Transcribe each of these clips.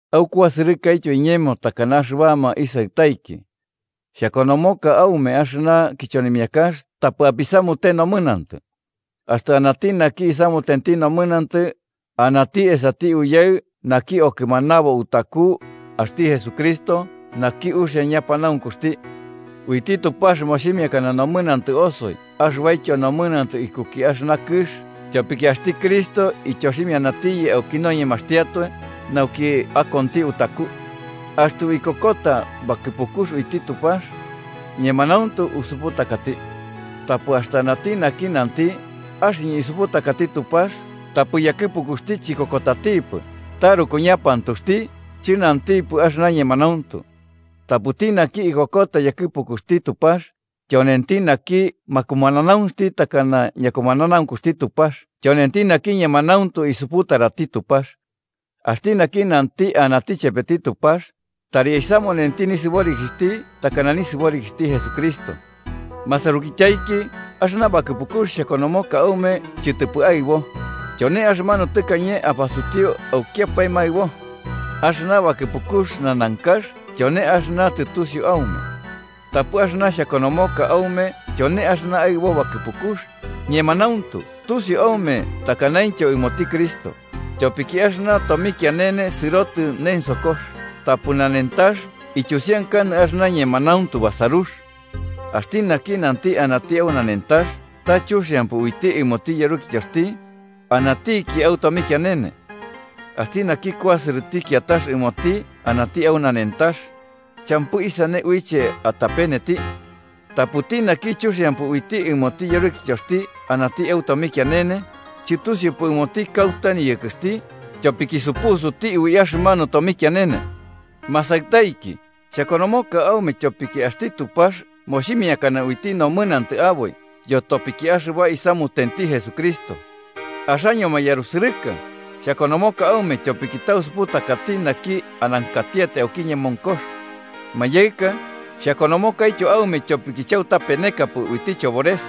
Aukuasɨrɨka iñemo takana axɨbama isaɨtaiki. Xhakonomoka aume axɨna kichonimiakax tapɨ apisamute nomɨnantɨ. Axtɨ anati naki isamutenti nomɨnantɨ, anati esati Uyaɨ naki okɨmanabo utaku, axti Jesucristo, naki uxia ñapanaunkuxti. Uiti Tupax moximiakana nomɨnantɨ osoi axɨbaityo nomɨnantɨ ikuki axɨna kɨx tyopiki axti Cristo ityoximianatiyɨ auki noñemaxtiatoe nauki akonti utaku. Axtɨ uikokota bakɨpukux uiti Tupax, ñemanauntu usuputakati. Tapɨ axtɨ anati naki nanti: “Axɨñɨ isuputakati Tupax”, tapɨ yakɨpukuxti chikokotatipɨ, taruku ñapantuxti, chɨnantipɨ axɨna ñemanauntu. Tapɨti naki ikokotati yakɨpukuxti Tupax, tyonenti naki makumananaunxti takana ñakumananaunkuxti Tupax tyonenti naki ñemanauntu isuputarati Tupax. Axti naki nanti anati chepeti Tupax, tari aisamunenti nisɨborikixhti takana nisɨborikixhti Jesucristo. Masarukityaiki, axɨna bakɨpukux xhakonomoka aume chɨtɨpɨ aɨbo: tyone axɨmanu tɨkañe apasutiu aukiapae maɨbo. Axɨna bakɨpukux nanankax tyone axɨna tɨtusiu aume. Tapɨ axɨna xhakonomoka aume tyone axɨna aɨbo bakɨpukux, ñemanauntu tusiu aume takanaintyo ɨmoti Cristo, tyopiki axɨna tomikianene sɨrotɨ nensokox tapɨ nanentax ityusiankanɨ axɨna ñemanauntu basarux. Axti naki nanti anati au nanentax, ta chuxiampɨ uiti ɨmoti yarukityoxti, anatiki au tomikianene. Axti naki kuasɨrɨti kiatax ɨmoti anati au nanentax, champɨ isane uiche atapeneti. Tapɨti naki chuxiampɨ uiti ɨmoti yarukityoxti anati au tomikianene, chɨtusiupɨ ɨmoti kauta niyɨkɨxti, tyopiki supusuti ui axɨmanu tomikianene. Masaɨtaiki, xhakonomoka aume tyopiki axti Tupax moximiakana uiti nomɨnantɨ aboi yotopiki axɨba isamutenti Jesucristo. Axaño mayarusɨrɨka, xhakonomoka aume tyopiki tausuputakati naki anankatiatai auki ñemonkox. Mayaɨka, xhakonomokaityo aume tyopiki chautapenekapɨ uiti chobores.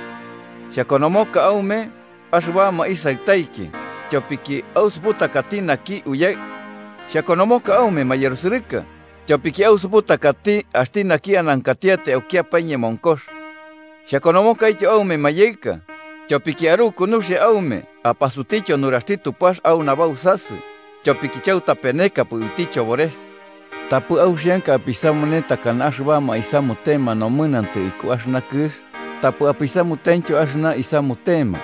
Xhakonomoka aume, axɨbama isaɨtaiki, tyopiki ausuputakati naki Uyaɨ. Xhakonomoka aume, mayarusɨrɨka, tyopiki ausuputakati axti naki anankatiatai aukiapae ñemonkox. Xhakonomokaityo aume mayaɨka, tyopiki aruku nuxia aume apasutiutyo nuraxti Tupax au nabausasɨ, tyopiki chautapenekapɨ uiti chobores. Tapɨ auxianka apisamune takana axɨbama isamutema nomɨnantɨ iku axɨna kɨx, tapɨ apisamutentyo axɨna isamutema.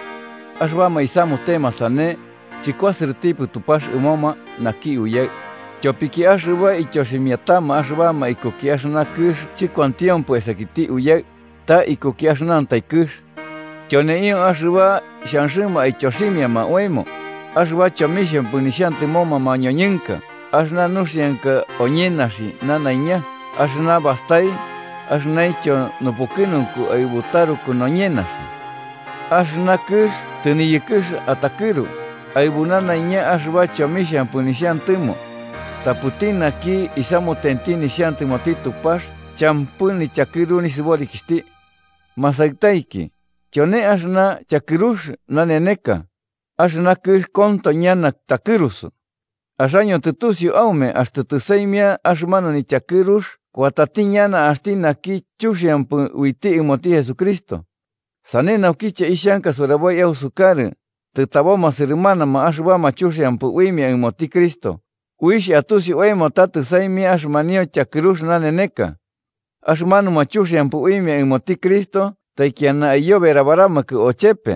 Axɨbama isamutema sane, chɨkuasɨrɨtipɨ Tupax ɨmoma naki Uyaɨ. Tyopiki axɨba ityoximiatama axɨbama ikuki axɨna kɨx chɨkuantiompɨ esakiti Uyaɨ, ta ikuki axɨnantai kɨx. Tyoneio axɨba xhanxɨma aityoximiama oemo: axɨba chomixhampɨ nuxiantɨmoma mañoñɨnka, axɨna nuxianka oñenaxine nanaiña axɨna bastai, axɨnaintyo nupukɨnunku aɨbu taruk noñenaxi. Axɨna kɨx tɨniyɨkɨx atakɨru, aɨbu nanaiña axɨba chomixhampɨ nixhantɨmo. Tapɨti naki isamutenti nixhantɨmoti Tupax champɨ nityakɨru nisɨborikixhti. Masaɨtaiki, tyone axɨna tyakɨrux naneneka, axɨna kɨx konto ñana takɨrusu. Axaño tɨtusiu aume axtɨ tɨsaimia axɨmanu nityakɨrux kuatati ñana axti naki chuxiampɨ uiti ɨmoti Jesucristo. Sane naukiche ixhanka suraboi ausukarɨ, tɨtaboma sɨrɨmanama axɨbama chuxiampɨ uimia ɨmoti Cristo, uixh atusi oemo ta tɨsaimia axɨmanio tyakɨrux naneneka. Axɨmanuma chuxiampɨ uimia ɨmoti Cristo taikiana aiyoberabaramakɨ ochepe,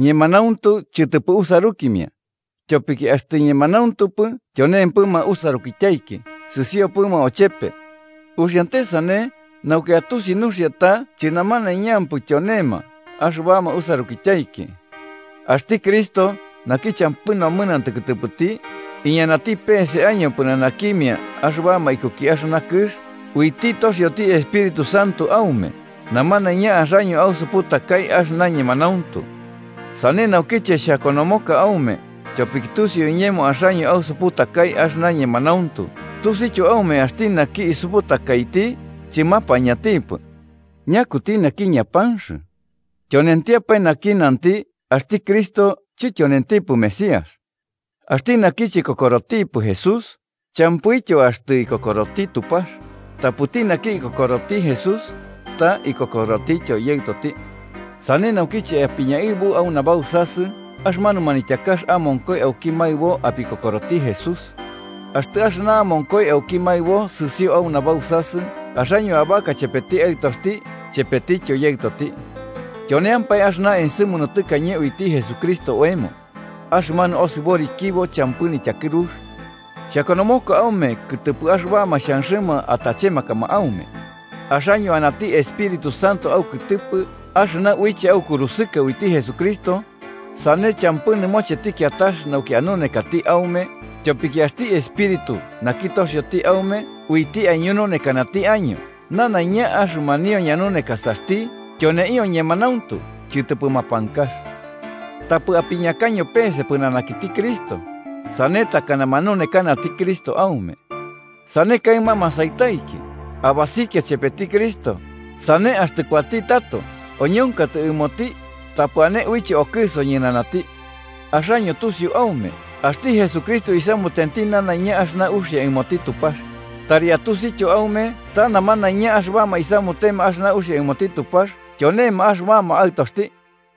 ñemanauntu chɨtɨpɨ usarukimia. Tyopiki axtɨ ñemanauntupɨ tyonempɨma usarukityaiki sɨsiopɨma ochepe. Uxiante sane nauki atusi nuxia ta chɨnamanaiñampɨ tyonema axɨbama usarukityaiki. Axti Cristo, naki champɨ nomɨnantɨ kɨtɨpɨti, iñanati pese año pɨnanakimia axɨbama ikuki axɨna kɨx, uiti toxioti Espíritu Santo aume, namanaiña axaño ausuputakai axɨna ñemanauntu. Sane naukiche xhakonomoka aume, tyopiki tusiu iñemo axaño ausuputakai axɨna ñemanauntu tusiuityo aume axti naki isuputakaiti chɨmapañantipɨ. ¿Ñakuti naki ñapanx? Tyonentiapae naki nanti axti Cristo chityonentipɨ Mesías. Axti naki chikokorotipɨ Jesús, champɨityo axtɨ ikokoroti Tupax, tapɨti naki ikokoroti Jesús, ta ikokorotityo Yaɨtoti. Sane naukiche apiñaɨbu au nabausasɨ axɨmanu manityakax amonkoi auki maɨbo apikokoroti Jesús. Axtɨ axɨna amonkoi auki maɨbo sɨsio au nabausasɨ, axaño abaka chepeti Aɨtoxti chepetityo Yaɨtoti. Tyoneampae axɨna ensɨmunu tɨkañe uiti Jesucristo oemo: axɨmanu osɨborikibo champɨ nityakɨrux. Xhakonomoka aume kɨtɨpɨ axɨbama xhanxɨma atachemakama aume. Axaño anati Espíritu Santo aukɨtɨpɨ axɨna uiche aukurusɨka uiti Jesucristo, sane champɨ nɨmocheti kiatax nauki anunekati aume, tyopiki axti Espíritu naki toxioti aume uiti aiñununekanati año nanaiña, axɨmanio ñanunekasaxti tyoneio ñemanauntu chɨtɨpɨ mapankax. Tapɨ apiñakaño pese pɨnanakiti Cristo, sane takana manunekanati Cristo aume. Sane kaɨma masaɨtaiki, abasikia chepeti Cristo, sane axtɨ kuatati tato oñonkatɨ ɨmoti tapɨ ane uiche okɨso ñɨnanati. Axaño tusiu aume, axti Jesucristo isamutenti nanaiña axɨna uxia ɨmoti Tupax, tari atusityo aume ta namanaiña axɨbama isamutema axɨna uxia ɨmoti Tupax tyonema axɨbama aɨtoxti.